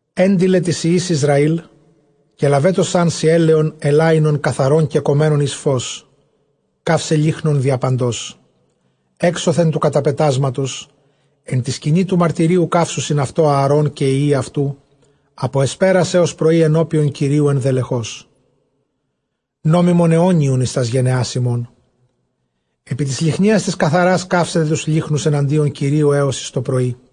ἔντειλαι τοῖς υἱοῖς Ἰσραὴλ, καὶ λαβέτωσάν σοι ἔλαιον ἐλάϊνον καθαρὸν κεκομμένον εἰς φῶς, καῦσαι λύχνον διαπαντὸς, ἔξωθεν τοῦ καταπετάσματος ἐν τῇ σκηνῇ τοῦ μαρτυρίου· καὶ καύσουσιν αὐτὸ Ἀαρὼν καὶ οἱ υἱοὶ αὐτοῦ ἀπὸ ἑσπέρας ἕως πρωῒ ἐνώπιον Κυρίου ἐνδελεχῶς, νόμιμον αἰώνιον εἰς τὰς γενεὰς ὑμῶν. Ἐπὶ τῆς λυχνίας τῆς καθαρᾶς καύσετε τοὺς λύχνους ἐναντίον Κυρίου ἕως εἰς τοπρωΐ.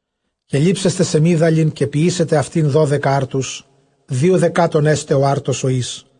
Καὶ λήμψεσθε σεμίδαλιν, καὶ ποιήσετε αὐτὴν δώδεκα ἄρτους· δύο δεκάτων ἔσται ὁ ἄρτος ὁ εἷς.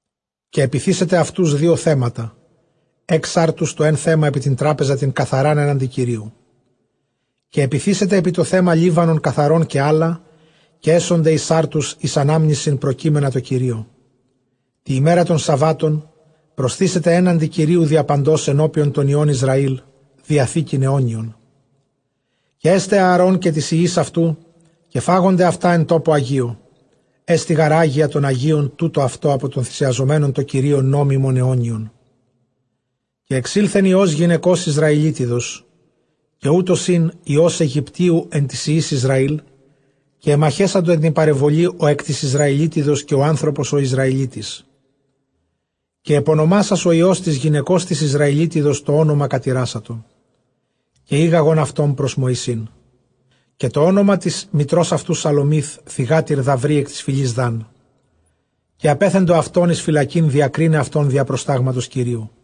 Καὶ ἐπιθήσετε αὐτοὺς δύο θέματα, ἓξ ἄρτους τὸ ἓν θέμα ἐπὶ τὴν τράπεζαν τὴν καθαρὰν ἔναντι Κυρίου. Καὶ ἐπιθήσετε ἐπὶ τὸ θέμα λίβανον καθαρὸν καὶ ἅλα, καὶ ἔσονται εἰς ἄρτους εἰς ἀνάμνησιν προκείμενα τῷ Κυρίῳ. Τῇ ἡμέρᾳ τῶν σαββάτων προσθήσεται ἔναντι Κυρίου διαπαντὸς ἐνώπιον τῶν υἱῶν Ἰσραὴλ, διαθήκην αἰώνιον. Καὶ ἔσται Ἀαρὼν καὶ τοῖς υἱοῖς αὐτοῦ· καὶ φάγονται αὐτὰ ἐν τόπῳ ἁγίῳ· ἔστι γὰρ ἅγια τῶν ἁγίῳν τοῦτο αὐτῶν ἀπὸ τῶν θυσιαζομένων τῷ Κυρίῳ, νόμιμον αἰώνιον. Καὶ ἐξῆλθεν υἱὸς γυναικὸς Ἰσραηλίτιδος, καὶ οὗτος ἦν υἱὸς Αἰγυπτίου ἐν τοῖς υἱοῖς Ἰσραήλ· καὶ ἐμαχέσαντο ἐν τῇ παρεμβολῇ ὁ ἐκ τῆς Ἰσραηλίτιδος, καὶ ὁ ἄνθρωπος ὁ Ἰσραηλίτης. Καὶ ἐπονομάσας ὁ υἱὸς τῆς γυναικὸς τῆς Ἰσραηλίτιδος τὸ ὄνομα κατηράσατο· καὶ ἤγαγον αὐτὸν πρὸς Μωυσῆν· καὶ τὸ ὄνομα τῆς μητρὸς αὐτοῦ Σαλωμεὶθ θυγάτηρ Δαβρεὶ ἐκ τῆς φυλῆς Δάν. Καὶ ἀπέθεντο αὐτὸν εἰς φυλακὴν διακρῖναι αὐτὸν διὰ προστάγματος Κυρίου.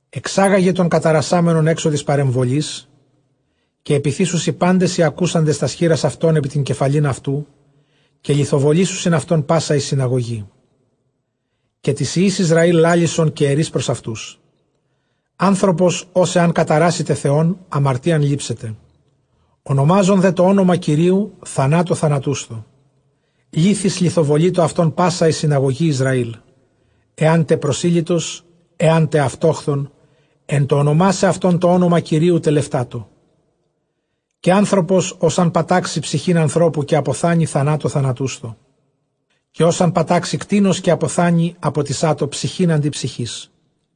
ἐξάγαγε τὸν καταρασάμενον ἔξω τῆς παρεμβολῆς, καὶ ἐπιθήσουσι πάντες οἱ ἀκούσαντες τὰς χεῖρας αὐτῶν ἐπὶ τὴν κεφαλὴν αὐτοῦ, καὶ λιθοβολήσουσιν αὐτὸν πᾶσα ἡ συναγωγή. Καὶ τοῖς υἱοῖς Ἰσραὴλ λάλησον, καὶ ἐρεῖς πρὸς αὐτοὺς, ἄνθρωπος ὃς ἐὰν καταράσηται Θεὸν, ἁμαρτίαν λήψεται. Ὀνομάζων δὲ τὸ ὄνομα Κυρίου, θανάτῳ θανατούσθω· λίθοις λιθοβολείτω αὐτὸν πᾶσα ἡ συναγωγὴ Ἰσραήλ· ἐάν τε προσήλυτος ἐάν τε αὐτόχθων, ἐν τῷ ὀνομάσαι αὐτὸν τὸ ὄνομα Κυρίου, τελευτάτω. Καὶ ἄνθρωπος ὃς ἂν πατάξῃ ψυχὴν ἀνθρώπου, καὶ ἀποθάνῃ, θανάτῳ θανατούσθω. Καὶ ὃς ἂν πατάξῃ κτῆνος, καὶ ἀποθάνῃ, ἀποτισάτω ψυχὴν ἀντὶ ψυχῆς.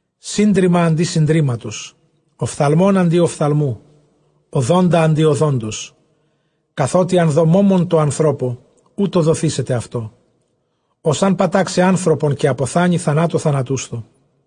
Σύντριμμα ἀντὶ συντρίμματος, ὀφθαλμὸν ἀντὶ ὀφθαλμοῦ, ὀδόντα ἀντὶ ὀδόντος, καθότι ἂν δῷ μῶμον τῷ ἀνθρώπῳ, οὕτω δοθήσεται αὐτῷ. Ὃς ἂν πατάξῃ ἄνθρωπον, καὶ ἀποθάνῃ, θανάτῳ θανατούσθω.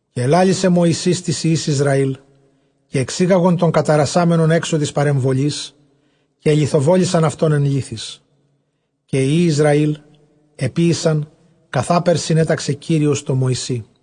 Καὶ ἐλάλησε Μωυσῆς τοῖς υἱοῖς Ἰσραήλ· καὶ ἐξήγαγον τὸν καταρασάμενον ἔξω τῆς παρεμβολῆς, καὶ ἐλιθοβόλησαν αὐτὸν ἐν λίθοις· καὶ οἱ υἱοὶ Ἰσραὴλ ἐποίησαν καθάπερ συνέταξε Κύριος τῷ Μωυσῇ.